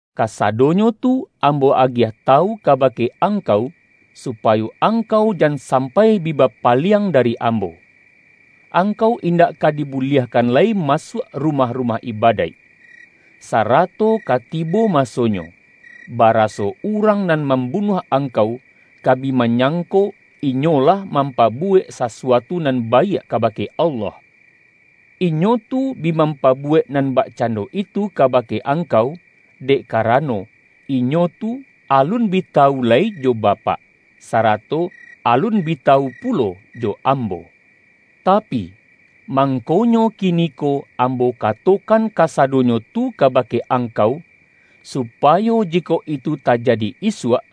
Kasadonyo tu Ambo agiah tawu kabake angkau, supayo angkau jan sampai bi bapaliang dari Ambo. Angkau indak ka dibuliahkan lai ma-suak rumah-rumah ibadaik. Sarato ka tibo masonyo, baraso urang nan mam-bunuah angkau, ka bi manyangko inyo lah mampabuwek sasuatu nan baiak kabake Allah. Inyo tu bi mampabu-wek nan bakcando itu kabake ang-kau, dek karano, inyo tu alun bi ta-wu lai jo Bapak, sarato alun bi tawu pulo jo Ambo. Tapi, mangkonyo ki-niko Ambo katokan kasadonyo tu ka-bake angkau, supayo jikok itu tajadi isuak,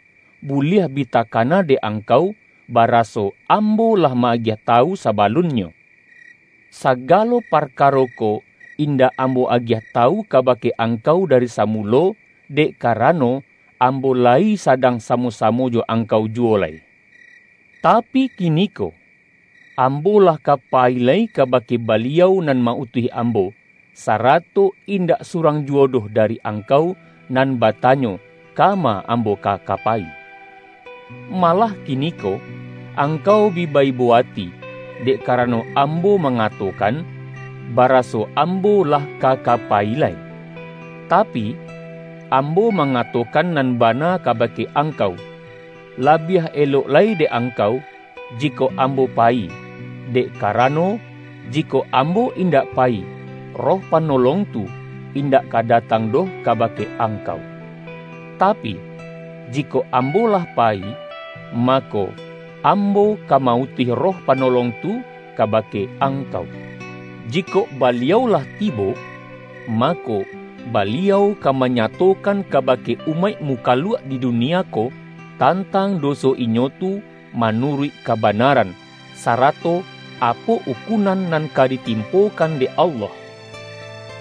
buliah bi takana dek angkau, baraso Ambo lah ma-agiah tawu sa-balunnyo.””Sagalo parkaro ko indak Ambo agiah tawu kabake angkau dari sa-mulo, dek karano, Ambo layi sadang samo-samo jo angkau juwo lai. Tapi kiniko, Ambo lah ka payi lai kaba-ke Baliau nan ma-utuih Ambo, sara-to indak surang juwo doh dari angkau nan batanyo, kama Ambo ka ka payi. Malah kiniko angkau bi ba-ibo ati, dek karano Ambo mangatokan, ba-raso Ambo lah ka ka payi lai. Tapi, Ambo mangatokan nan bana kabake angkau: Labiah elok lai dek angkau, jikok Ambo payi, dek karano, jikok Ambo indak payi, Roh Panolong tu, indak ka datang doh kabake angkau. Tapi, jikok Ambo lah payi, mako, Ambo ka ma-utuih Roh Panolong tu kabake angkau. Jikok Baliau lah tibo, mako, Baliau ka manyatokan kabake umaik mukaluak di dunia ko, tantang do-so inyo tu manuruik kabanaran, sa-rato apo ukunan nan ka ditimpokan dek Allah.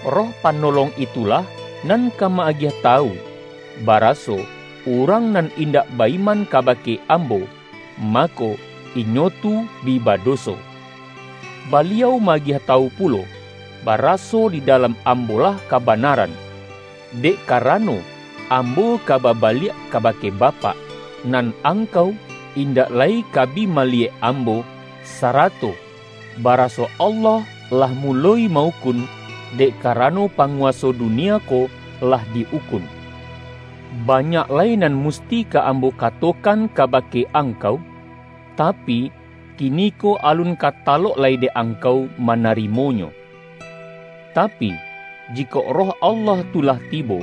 Roh Panolong itulah nan ka ma-agiah tawu, baraso urang nan indak ba-iman kabake Ambo, mako, inyo tu bi badoso. Baliau ma-agiah tawu pulo, baraso di dalam Ambo-lah kabanaran, dek karano Ambo ka ba-baliak kabake Bapak, nan angkau in-dak lai ka bi maliyek Ambo, sara-to baraso Allah lah muloi ma-ukun, dek karano panguwaso dunia ko lah di-ukun. Banyak lai nan musti ka Ambo katokan kabake angkau, tapi, kiniko alun ka talok lai dek angkau manari-monyo. Tapi, jikok Roh Allah tu lah tibo,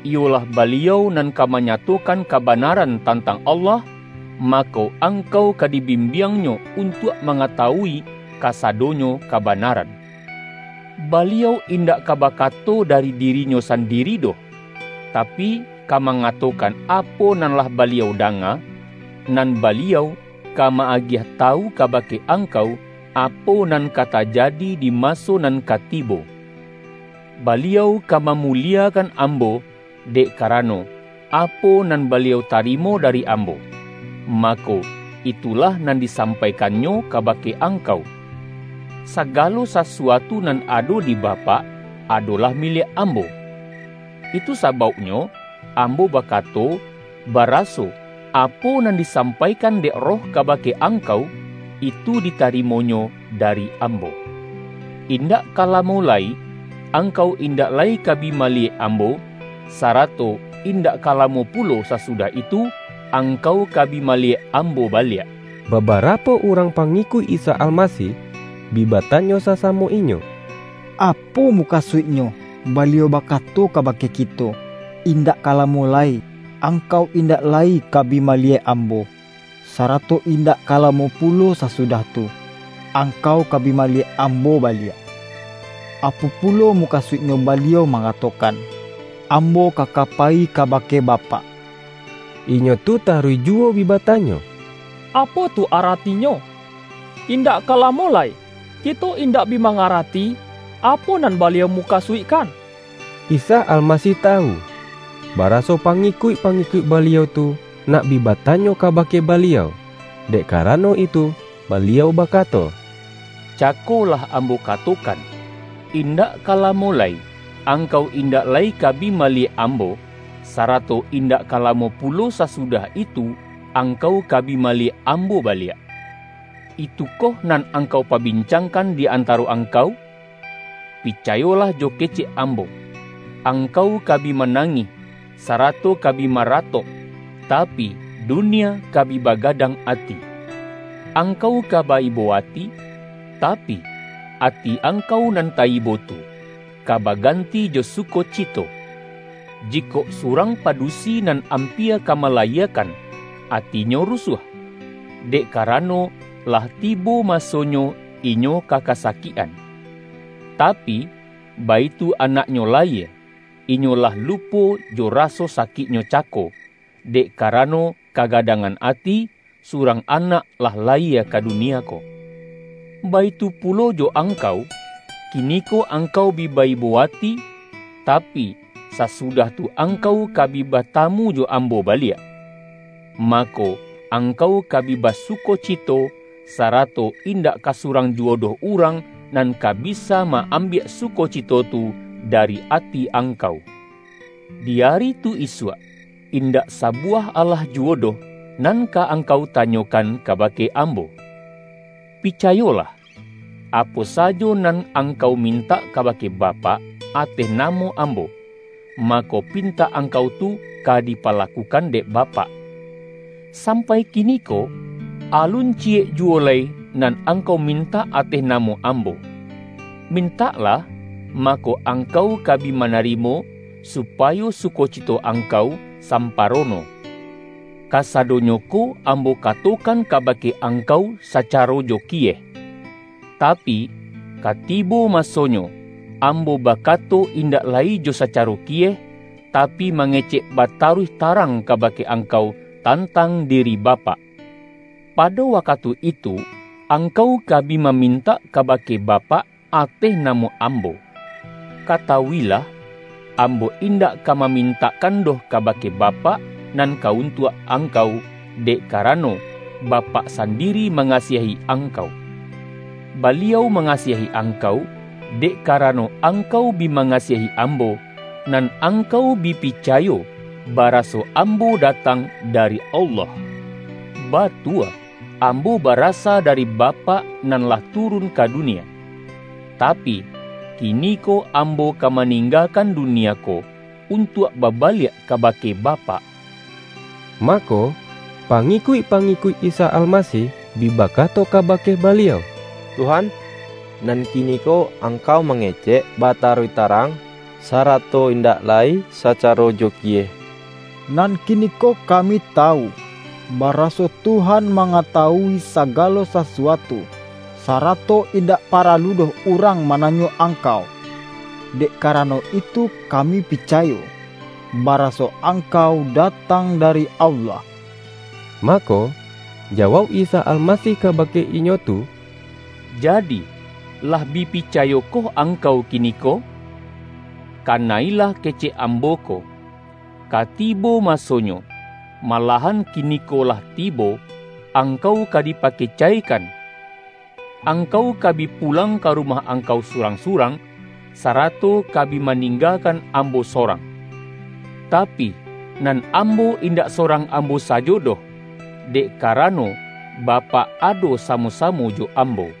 iyolah Baliau nan ka manyatokan kabanaran tantang Allah, mako, ang-kau ka dibimbiang-Nyo untuak manga-tawui kasadonyo kabanaran. Baliau indak ka bakato dari diri-Nyo sandiri doh, tapi ka mangatokan apo nan lah Baliau danga, nan Baliau ka ma-agiah tawu kabake angkau, apo nan ka ta-jadi di maso nan ka tibo. Baliau ka mamuliekan Ambo, dek karano, apo nan Baliau tarimo dari Ambo, mako, itulah nan disampaikan-Nyo kabake angkau. Sagalo sasuatu nan ado di Bapak, adolah miliak Ambo. Itu sa-bauknyo Ambo bakato, baraso, apo nan disampaikan dek Roh kabake angkau, itu ditarimo-Nyo dari Ambo.” ”Indak ka lamo lai, angkau indak lai ka bi maliyek Ambo, sarato indak ka lamo pulo sasudah itu, angkau ka bi maliyek Ambo baliak.” Babarapo urang pangikuik Isa Almasih, bi batanyo sasamo inyo,”Apo mukasuiknyo Baliau bakato kabake ki-to: ’Indak ka lamo lai, angkau indak lai ka bi maliyek Ambo, sarato indak ka lamo pulo sasudah tu, angkau ka bi maliyek Ambo baliak'? Apo pulo mu-kasuiknyo Baliau mangatokan: ’Ambo ka ka payi kabake Bapak'?” Inyo tu taruih juwo bi batanyo,”Apo tu ara-tinyo, ’Indak ka lamo lai'? Kito indak bi mangarati, apo nan Baliau muka-suikkan!” Isa Almasih tawu, baraso pangi-kuik-pangikuik Baliau tu nak bi ba-tanyo kabake Baliau. Dek karano itu Baliau bakato,”Cako lah Ambo kato-kan, ’Indak ka lamo lai, angkau in-dak lai ka bi maliyek Ambo, sarato indak ka lamo pulo sasudah itu, ang-kau ka bi maliyek ambo baliak.’ Itu-koh nan angkau pabincangkan di an-taro angkau? Picayolah jo kecek Ambo, angkau ka bi manangih, sarato ka bi maratok, tapi, dunia ka bi bagadang ati. Angkau ka ba-ibo ati, tapi, ati angkau nan ta-ibo tu, ka baganti jo sukocito. Jikok surang padusi nan ampia ka malayie-kan, atinyo rusuah, dek karano, lah tibo masonyo inyo ka kasakik-an. Ta-pi, baitu anaknyo layie, inyo lah lu-po jo raso sakiknyo cako, dek karano kagadangan ati, surang anak lah la-yie ka dunia ko. Baitu pulo jo ang-kau: Kiniko angkau bi ba-ibo ati, ta-pi, sasudah tu angkau ka bi batamu jo Ambo baliak, mako, angkau ka bi basukocito, sarato indak ka surang ju-wo doh urang nan ka bisa ma-ambiak sukocito tu dari ati angkau. Di ari tu isuak, indak sabuwah alah juwo doh, nan ka angkau tanyo-kan kabake Ambo. Picayolah: Apo sajo nan angkau mintak kabake Bapak, ateh namo Ambo, mako, pintak angkau tu ka dipalakukan dek Bapak. Sampai kiniko, alun ciyek juwo lai nan angkau mintak ateh namo Ambo. Mintaklah, mako, angkau ka bi manarimo, supayo sukocito angkau samparono.” ”Kasadonyo ko Ambo katokan ka-bake angkau sacaro jo kiyeh. Tapi, ka tibo masonyo, Ambo bakato indak lai jo sacaro kiyeh, tapi, mangecek bata-ruih tarang kabake angkau tantang diri Bapak. Pado wakatu itu, angkau ka bi mamintak kabake Bapak ateh na-mo Ambo. Katawuilah, Ambo indak ka mamintakkan doh kabake Bapak nan ka untuak angkau, dek karano, Bapak sandiri mangasiahi angkau. Ba-liau mangasiahi angkau, dek karano angkau bi mangasiahi Ambo, nan angkau bi picayo baraso Ambo datang dari Allah. Batua, Ambo barasa dari Ba-pak, nan lah turun ka dunia. Tapi, ki-niko Ambo ka maninggakan dunia ko, untuak babaliak kabake Bapak.” Mako, pangikuik-pangikuik Isa Almasih bi bakato kabake Baliau,”Tuhan, nan kiniko Angkau mange-cek bataruih tarang, sarato indak lai sacaro jo kiyeh. Nan kiniko kami tawu, baraso Tuhan mangatawui sa-galo sasuatu, sarato indak paralu doh urang mananyo Angkau. Dek karano itu kami picayo, baraso Angkau da-tang dari Allah.” Mako, jawauk Isa Almasih kabake inyo tu,”Jadi, lah bi picayokoh ang-kau kiniko? Kana-ilah kecek Ambo ko! Ka tibo masonyo, malahan kini-ko lah tibo, angkau ka dipakecaikan. Angkau ka bi pulang ka rumah angkau surang-surang, sarato ka bi maning-gakan Ambo sorang. Tapi, nan Ambo indak sorang Ambo sajo doh, dek ka-rano, Bapak ado samo-samo jo Am-bo.